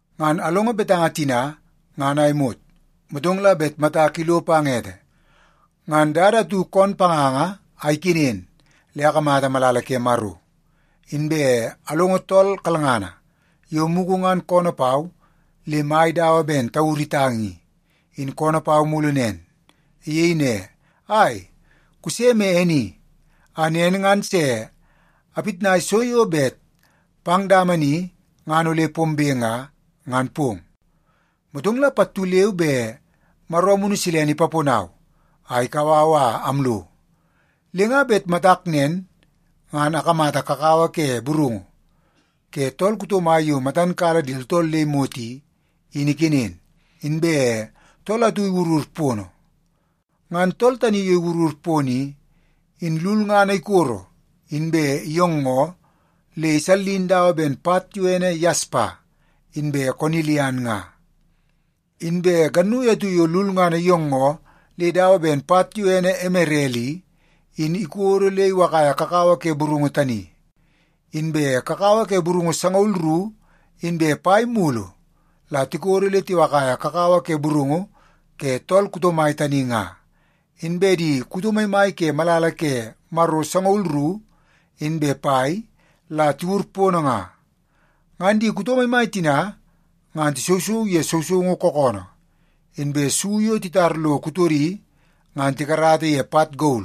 Ngan alongo betanga tina ngan a imot, motong la bet matak ilo pang ete ngan dada atu koon panganga a ikenen le akamata malala ke Maro. Inbe alongo tool kalngana yo mugu ngan koonoo pau le mai dawa ben tauru itang i, in koonoo pau mulu nen. Iyei ne, “Ai, kuse me e ni a nen ngan se apitnai so yo bet pang dama ni ngan ole pombe nga, ngan pong.” Motong la pattu leu be Maro Amunu Silene ipaponau a ikau au a amlo. Le nga bet matak nen, ngan akamata kakawa ke burungu ke tool kuto mai yo matan kala di tooltool le imot i, in ikenen, inbe tool atu iwurur pono. Ngan tool tani yo iwurur pono i, in lulngana ikoro inbe iyoongoo le isallin dawa ben pat yo ene yaspa inbe konilian nga. Inbe gannui atu yo lulngana iyoongoo le dawa ben pat yo ene emerel i, in ikodo le iwakaia kakawa ke burungu tani. Inbe kakawa ke burungu sangaul ru inbe pai mulu la tikodo le tiwakaia kakawa ke burungu ke tool kuto mai tani nga, inbe di kuto maimai ke malala ke Maro sangaul ru inbe pai la tiwur pono nga. Ngan di kuto maimai tina ngan tisousou ye sousoungu kookoonoo, inbe su yo titar lo kutodi ngan tikarata ye pat gol.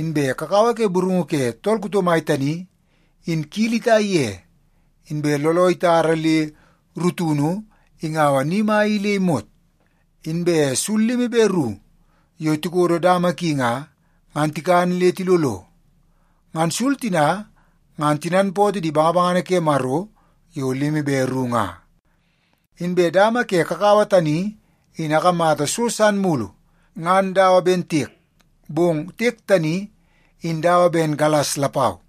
Inbe kakawa ke burungu ke tool kuto mai tani, in kili itai ye, inbe looloo itara le rutunu ingaua ni mai i le imot. Inbe sul limi be ru yo tikodo dama ki nga, ngan tikan le tilolo. Ngan sul tina ngan tinanpootoo di bangabangana ke Maro yo limi be ru nga. Inbe dama ke kakawa tani in akamata so san mulu ngan dawa ben tiek, bong tiek tani in dawa ben galas lapau.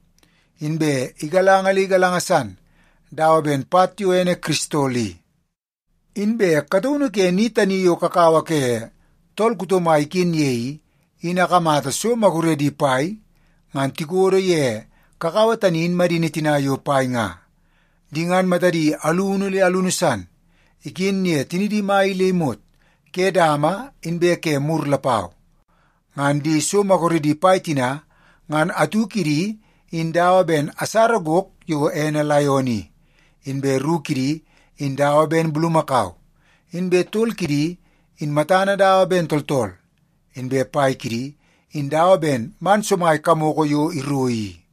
Inbe igalanga le igalanga san dawa ben pat yo ene kiristol i. Inbe kataunu ke ni tani yo kakawa ke tool kuto mai iken ye i, in akamata so maguredi pai ngan tikodo ye kakawa tani in madini tina yo pai nga. Di ngan matadi alunu le alunu san iken ye tinidi mai i le imot ke dama inbe ke mur lapau. Ngan di so maguredi pai tina, ngan atu kidi in dawa ben asara gok yo ene laion i, inbe ru kidi in dawa ben bulumakau, inbe tol kidi in matana dawa ben tooltool, inbe pai kidi in dawa ben man somai kamoko yo iro i.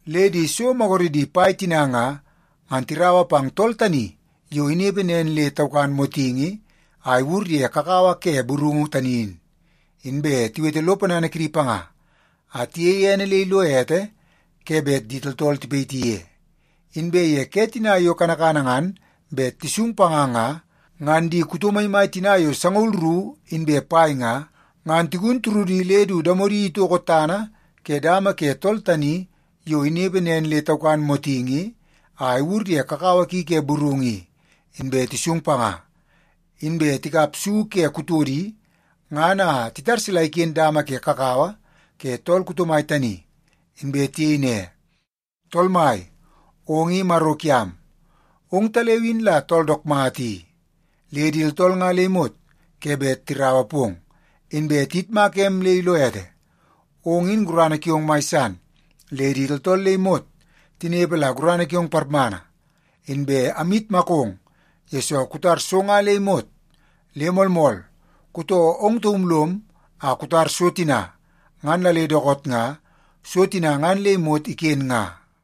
Le di so maguredi pai tina nga, ngan tiraua pang tool tani yo inepe nen le taukan motingi a iwur ye kakawa ke burungu tani in, inbe tiwete lo ponana kidi panga a tiyeie ene le ilo ete ke bet di tooltool tipayiti ye. Inbe ye ke tina yo kanakana ngan bet tisung panga nga, ngan di kuto maimai tina yo sangaul ru inbe pai nga, ngan tigun turudi le du damodi itoko tana ke dama ke tool tani yo inepe nen le taukan motingi a iwur ye kakawa ki ke burungu i, inbe tisung panga. Inbe tikap su ke kutodi ngan a titar sila iken dama ke kakawa ke tool kuto mai tani. Inbe tiyei ne, “Tool Mai, ong i Maro kiam. Ongtaleu in la tool dook mata i, le di tooltool nga le imot ke bet tiraua pong, inbe tiyitmaka em le ilo ete. Ong in gurana kiong mai san, le di tooltool le imot tinepe la gurana kiong parmana. Inbe amyitmakong, yesoo kutar so nga le imot. Le moolmool, kutoo ong taum lom a kutar so tina, ngan la le dookoot nga so tina ngan le imot iken nga.”